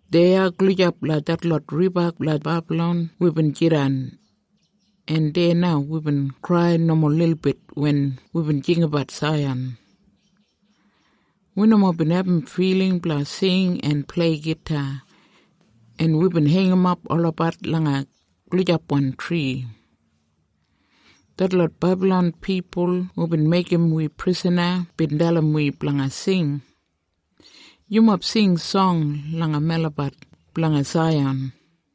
Deya gulijap langa detlot riba langa Bebalon wibin jidan, en deya na wibin krai nomo lilbit wen wibin jinggabat Saiyan. Wi nomo bin abum filing blanga sing en plei gita, en wibin heingimap olabat langa gulijapwan tri. Detlot Bebalon pipul hubin meigim wi prisana bin dalim wi blanga sing, “Yumob sing song langa melabat blanga Saiyan.”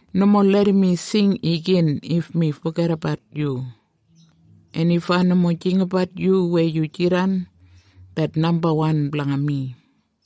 Nomo larram mi sing igin if mi fogedabat yu, en if ai nomo jinggabat yu weya yu jidan det nambawan blanga mi.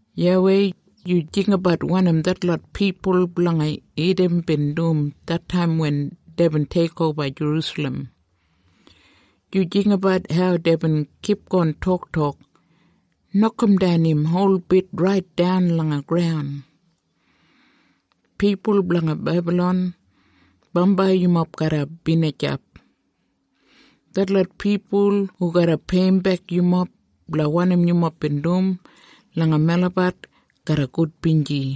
YAWEI, yu jinggabat wanim detlot pipul blanga Idam bin dum detaim wen deibin teikoba Jerusalem. Yu jinggabat hau deibin kipgon toktok, “Nokamdan im holbit raitdan langa graun.” Pipul blanga Bebalon, bambai yumob garra binijap. Detlot pipul hu garra peiyimbek yumob blanga wanim yumob bin dum langa melabat, garra gudbinji.